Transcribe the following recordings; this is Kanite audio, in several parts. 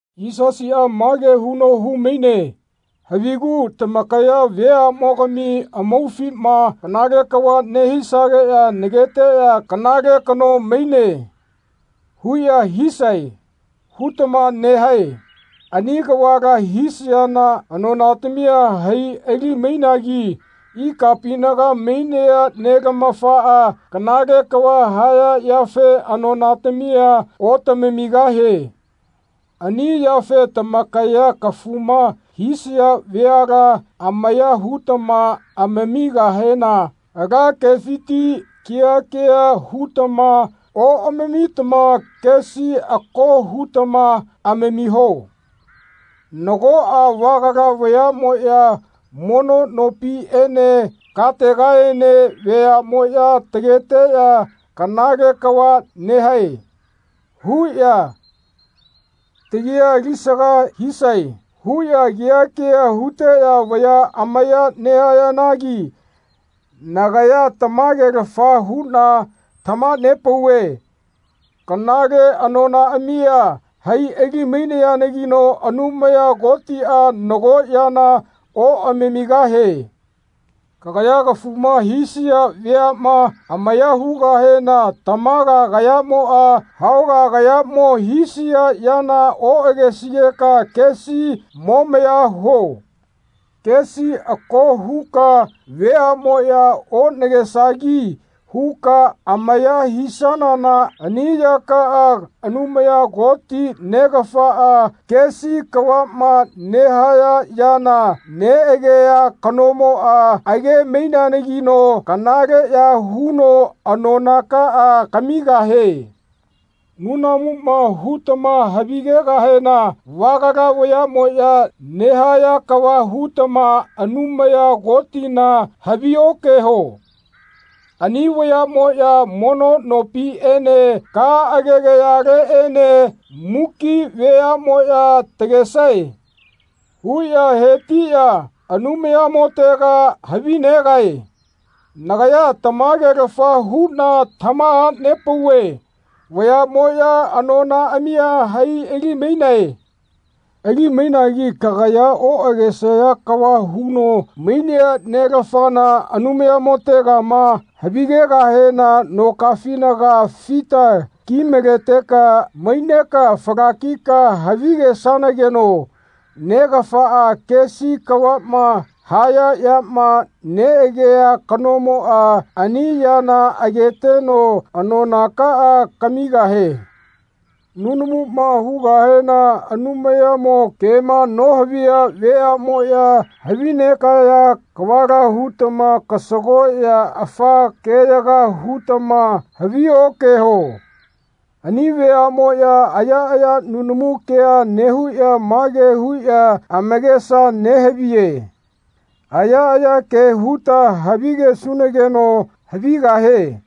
Yisasiꞌa mage huno hu-maine “Havigu tamakaya veaꞌmogami amaufima kanale kava nehisageꞌya ‘Nageteꞌya kanale kano maine.’ huꞌya hisae.” hutama nehae. Ani kavala hisayana anonatamia hai ali-mainagi ikapinaga mainea Nelamafaꞌa kanale kava haya yafe anonatamia otamamigahie. Ani yafe tamakaya kafuma hisaya veala amaya hutamama amamigahena ala kefiti keha keha hutama oꞌamamitama kesi ako hutama amamiho. Nagoꞌa vagala vayaꞌmoꞌya mono nopiꞌene kategaene “Veaꞌmoꞌya tageteꞌya ‘Kanale kava nehae.’ huꞌya takia alisaga hisae.” huꞌya keha keha huteꞌya vaya amaya nehayanagi nagaya tamagelafa huꞌna tamaha-nepauve kanale anonaꞌamia hai ali-mainayanagino Anumaya Kotiꞌa nago yana oꞌamamigahie. Kagaya kafuma hisaya veaꞌma amaya hugahena tamaga kayamoꞌa hauga kayamo hisia yana oꞌagesigeka kesi momaya huo. Kesi ako huka veaꞌmoꞌya onagesagi huka amaya hisanana ani yakaꞌa Anumaya Koti, Negafaꞌa, kesi kavaꞌma nehaya yana neꞌagea kanomoꞌa age-maineanagino kanaleꞌya huno anonakaꞌa kamigahie. Nunamuma hutama havigegahena vagala vayaꞌmoꞌya nehaya kava hutama Anumaya Kotina havi-okeho. Ani vayaꞌmoꞌya mono nopiꞌene ka agegayaleꞌene “Muki veaꞌmoꞌya tagesae.” huꞌya hetiꞌya Anumayamotega havinegae. Nagaya tamagelafa huꞌna tamaha-nepauve vayaꞌmoꞌya anonaꞌamia hai ali-mainae. Ali-mainagi kagaya oꞌagesaya kava huno mainea Nelafana Anumayamotegama havigegahena nokafinaga fita ki-maleteka maineka falakika havigesanageno Negafaꞌa kesi kavaꞌma haya yama neꞌagea kanomoꞌa ani yana ageteno anonakaꞌa kamigahie. Nunamuma hugahena Anumayamo kema nohaviya veaꞌmoꞌya havinegaya kavala hutama kasagoꞌya afa keyaga hutama havi-okeho. Ani veaꞌmoꞌya ayaꞌaya nunamu ke nehuꞌya mage huꞌya amakesa nehaviye “Ayaꞌaya ke huta havigesunageno havigahie.”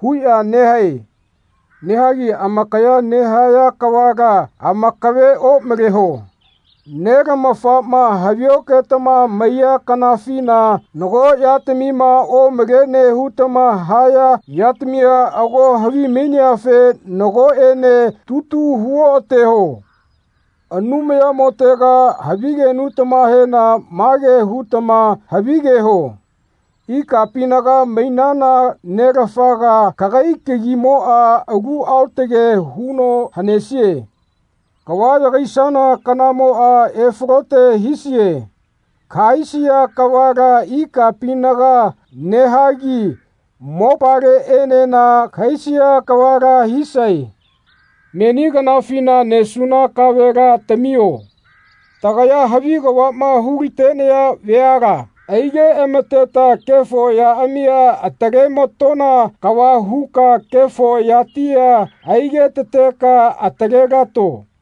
huꞌya nehae. Nehagi amakaya nehaya kavala amakave omaleho. Nelamafama havi-oketama maiya kanafina nago yatamima omalene hutama haya yatamia ago havimaineafe nagoꞌene tutu hu-oꞌateho. Anumayamotega havigenutamahena mage hutama havigeho “Ikapinaga mainana Nelafaga kagai kagimoꞌa alu aotage huno hanesie. Kava yagaisana kanamoꞌa efalote hisie. Kahaisia kavala ikapinaga nehagi mopaleꞌenena kahaisia kavala hisae. Meni kanafina nesuna kavela tamio. Tagaya havi kavaꞌma hu-la-tenaya veala aige amateta kefo yaꞌamia atale-ma-tona kava huka kefo yatia aige-tateka atale-lato.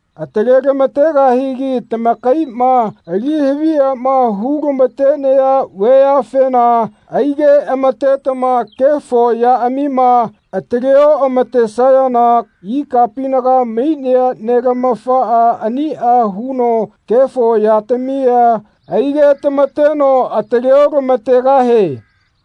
Atale-lama-tegahigi tamakaiꞌma ali-havi yama hu-lama-tenaya veafena aigeꞌama-tetama kefo yaꞌamima atale-oꞌama-tesayana ikapinaga mainea Nelamafaꞌa aniꞌa huno kefo yatamia aige-tama-teno atale-otamategahie.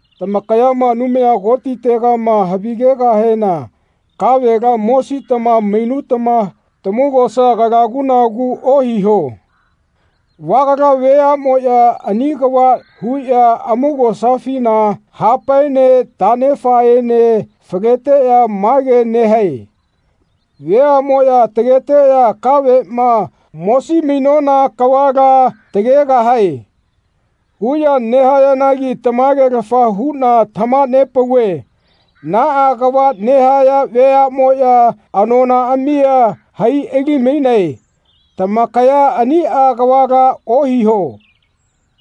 Tamakaya Anumaya Kotitegama havigegahena kavela mositama mainutama tamaugosa kalaguꞌnagu ohiho. Vagala veaꞌmoꞌya ani kava huꞌya amaugosafina hapaene taꞌnefaene faleteꞌya mage nehae “Veaꞌmoꞌya tageteꞌya kaveꞌma mosi-mainona kavala tagegahae.” huꞌya nehayanagi tamagelafa huꞌna tamaha-nepauve naꞌa kava nehaya veaꞌmoꞌya anonaꞌamia hai ali-mainae. Tamakaya aniꞌa kavala ohiho.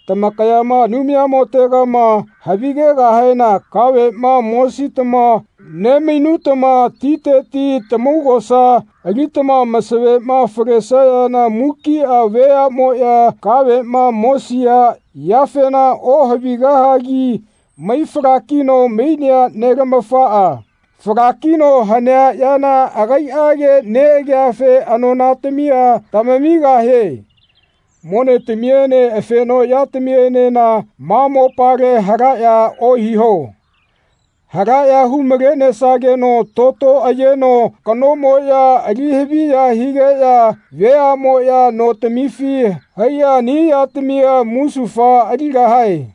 Tamakaya Anumayamotegama havigegahena kaveꞌma mositama nemainutama titeti tamaugosa alitama masavema falesayana mukiꞌa veaꞌmoꞌya kaveꞌma mosisaya yafena ohavigahagi mai falakino mainea Nelamafaꞌa falakino hanea yana agaiꞌage neꞌageafe anonatamia tamamigahie. Monetamiene afenoꞌyatamienena ma mopale halaꞌya ohiho. Halaꞌya hu-malenesageno toto ayeno hakaꞌnomoꞌya ali haviya higeꞌya veaꞌmoꞌya notamifi haiꞌya ani yatamia musufa aligahae.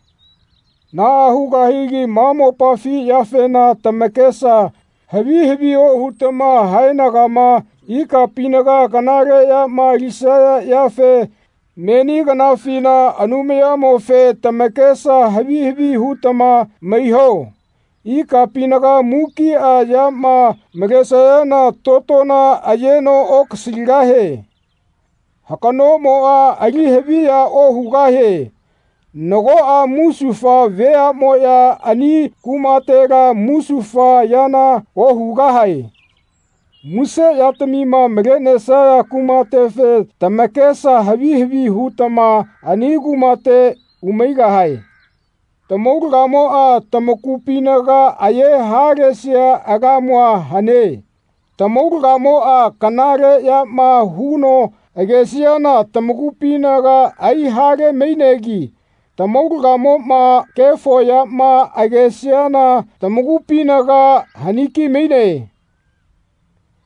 Naꞌa hugahagi ma mopafi yafena tamakesa havi havi ohutama haenagama ikapinaga kanale yama alisaya yafe meni kanafina Anumayamofe tamakesa havi havi hutama maiho. Ikapinaga mukiꞌa yama malesayana totona ayeno okasaligahie. Hakaꞌnomoꞌa ali haviya ohugahie. Nagoꞌa musufa veaꞌmoꞌya ani kumatela musufa yana ohugahae. Muse yatamima malenesaya kumatefe tamakesa havi havi hutama ani kumate umaigahae. Tamaulagamoꞌa tamakupinaga aye halesia lamu hane. Tamaulagamoꞌa kanale yama huno agesiana tamakupinaga ai-hale-mainegi tamaulagamoꞌma kefo yama agesiana tamakupinaga hani-ki-maine.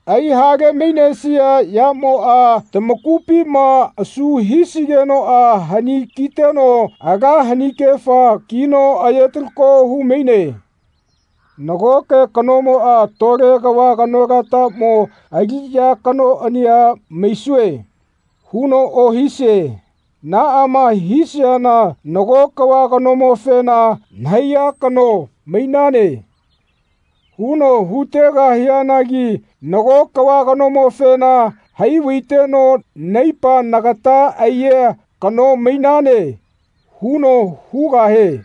Ai-hale mainesia yamoꞌa tamakupima asu hisigenoꞌa hani kiteno ala hanikefa kino aye-talako hu-maine. Nagoke kanomoꞌa “Tole kava kanolatamo aliꞌya kanoꞌania maisue.” huno ohisie. Naꞌama hisiana nago kava kanomofena “Nahaiya kano mainane.” huno hu-tegahianagi nago kava kanomofena “Hai vaiteno naipa nagata aiya kano mainane.” huno hugahie.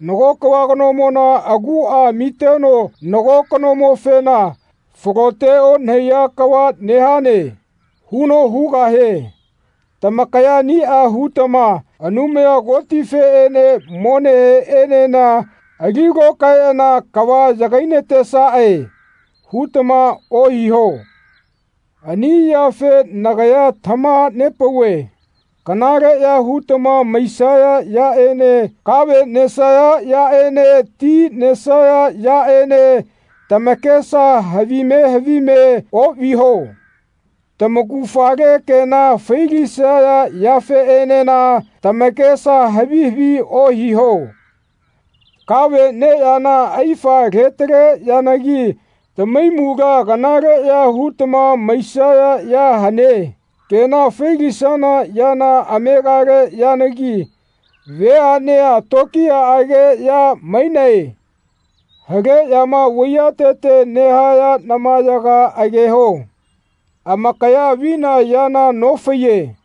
Nago kava kanomona aguꞌa amiteno nago kanomofena “Falote onahaiya kava nehane.” huno hugahie. Tamakaya aniꞌa hutama Anumaya Kotifeꞌene moneheꞌenena ali lokaeꞌana “Kava yagai-natesaꞌe.” hutama ohiho. Ani yafe nagaya tamaha-nepauve kanaleꞌya hutama maisaya yaꞌene kave nesaya yaꞌene ti nesaya yaꞌene tamakesa havime havime oꞌviho. Tamaugafale kena failisaya yafeꞌenena tamakesa havi havi ohiho. Kave neyana aifa letale yanagi tamahaimula kanaleꞌya hutama maisaya ya hane. Kena fai-lisana yana amegale yanagi veaꞌnea tokiyaꞌage ya mainae. Haleꞌyama vaiyatete nehaya namayaga ageho. Amakaya avina yana nofaiye.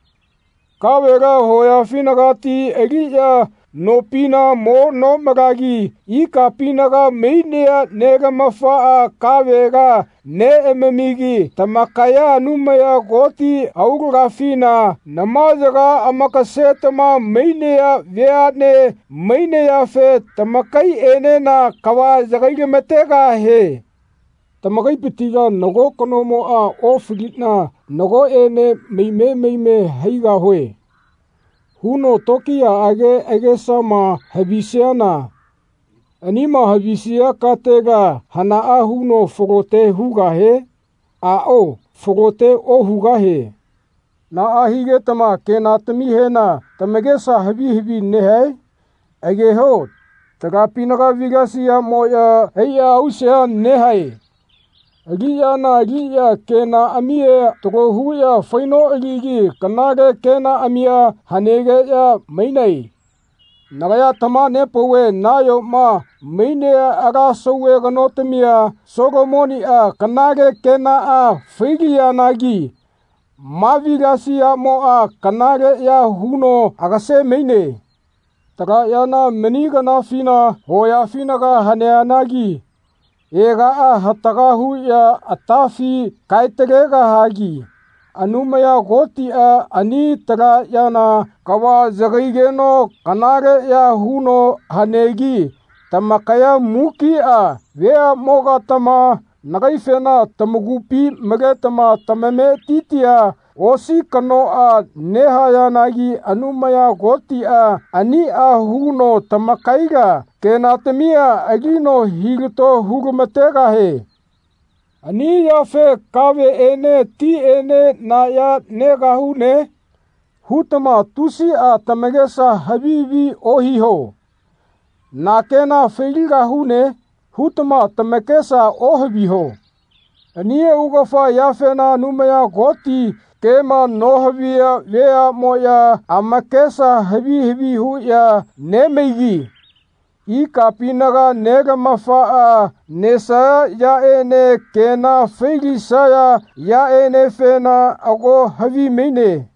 Kavela hoyafinagati aliꞌya nopina mo nomalagi ikapinaga mainea nelamafaꞌa kavela neꞌamamigi tamakaya Anumaya Koti aulagafina namayaga amakasetama mainaya veaꞌne mainayafe tamakaiꞌenena kava yakai-lama-tegahie. Tamakaipitila nago kanomoꞌa “Ofaliꞌna nagoꞌene maime maime haigahue.” huno tokiyaꞌage agesama havisiana anima havisia katela hanaꞌa huno falote hugahie? Aꞌao falote ohugahie. Naꞌa higetama kenatamihena tamakesa havi havi nehae? Ageho talapinaga vilasiyamoꞌya haiꞌya ausea nehae. Aliꞌyana aliꞌya kenaꞌamia talo huꞌya fai-noꞌaligi kanale kenaꞌamia hanegeꞌya mainae. Nagaya tamaha-nepauve nayoma mainea ala sauve kanotamia Solomoniꞌa kanale kenaꞌa fai-lianagi ma vilasiyamoꞌa kanaleꞌya huno agase-maine. Tala yana meni kanafina hoyafina haneanagi ega hataga huꞌya atafi kae-talegahagi Anumaya Kotiꞌa ani tala yana kava yagaigeno kanaleꞌya huno hanegi tamakaya mukiꞌa veaꞌmogatama nagaifena tamakupi maletama tamametitia osi kanoꞌa nehayanagi Anumaya Kotiꞌa aniꞌa huno tamakaila kenatamia alino hilato hu-lamategahie. Ani yafe “Kaveꞌene tiꞌene na ya negahune?” hutama tusiꞌa tamakesa havi havi ohiho. “Na kena fai-ligahune?” hutama tamakesa ohaviho. Ani augafa yafena Anumaya Koti kema nohaviya veaꞌmoꞌya amakesa havi havi huꞌya nemaigi ikapinaga Nelamafaꞌa nesaya yaꞌene kena fai-lisaya yaꞌenefena ago havimaine.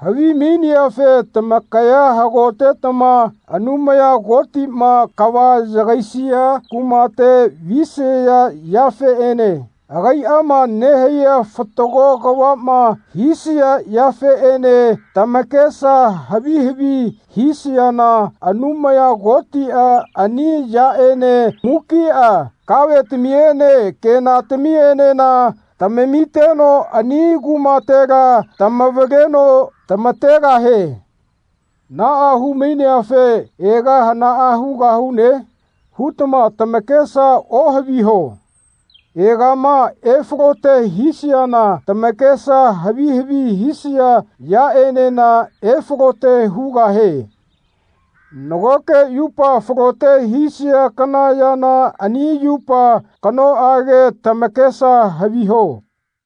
Havimaineafe tamakaya hagotetama Anumaya Kotiꞌma kava yagaisia kumate visaya yafeꞌene agaiꞌama nehaiya fatago kavaꞌma hisaya yafeꞌene tamakesa havi havi hisayana Anumaya Kotiꞌa ani yaꞌene mukiꞌa kavetamiene kenatamienena tamamiteno ani kumatela tamavaleno tamategahie. Naꞌa hu-maineafe “Ega hanaꞌa hugahune?” hutama tamakesa ohaviho. Egama efalote hisiana tamakesa havi havi hisaya yaꞌenena efalote hugahie. Nagoke yupa falote hisia kana yana ani yupa kanoꞌage tamakesa haviho.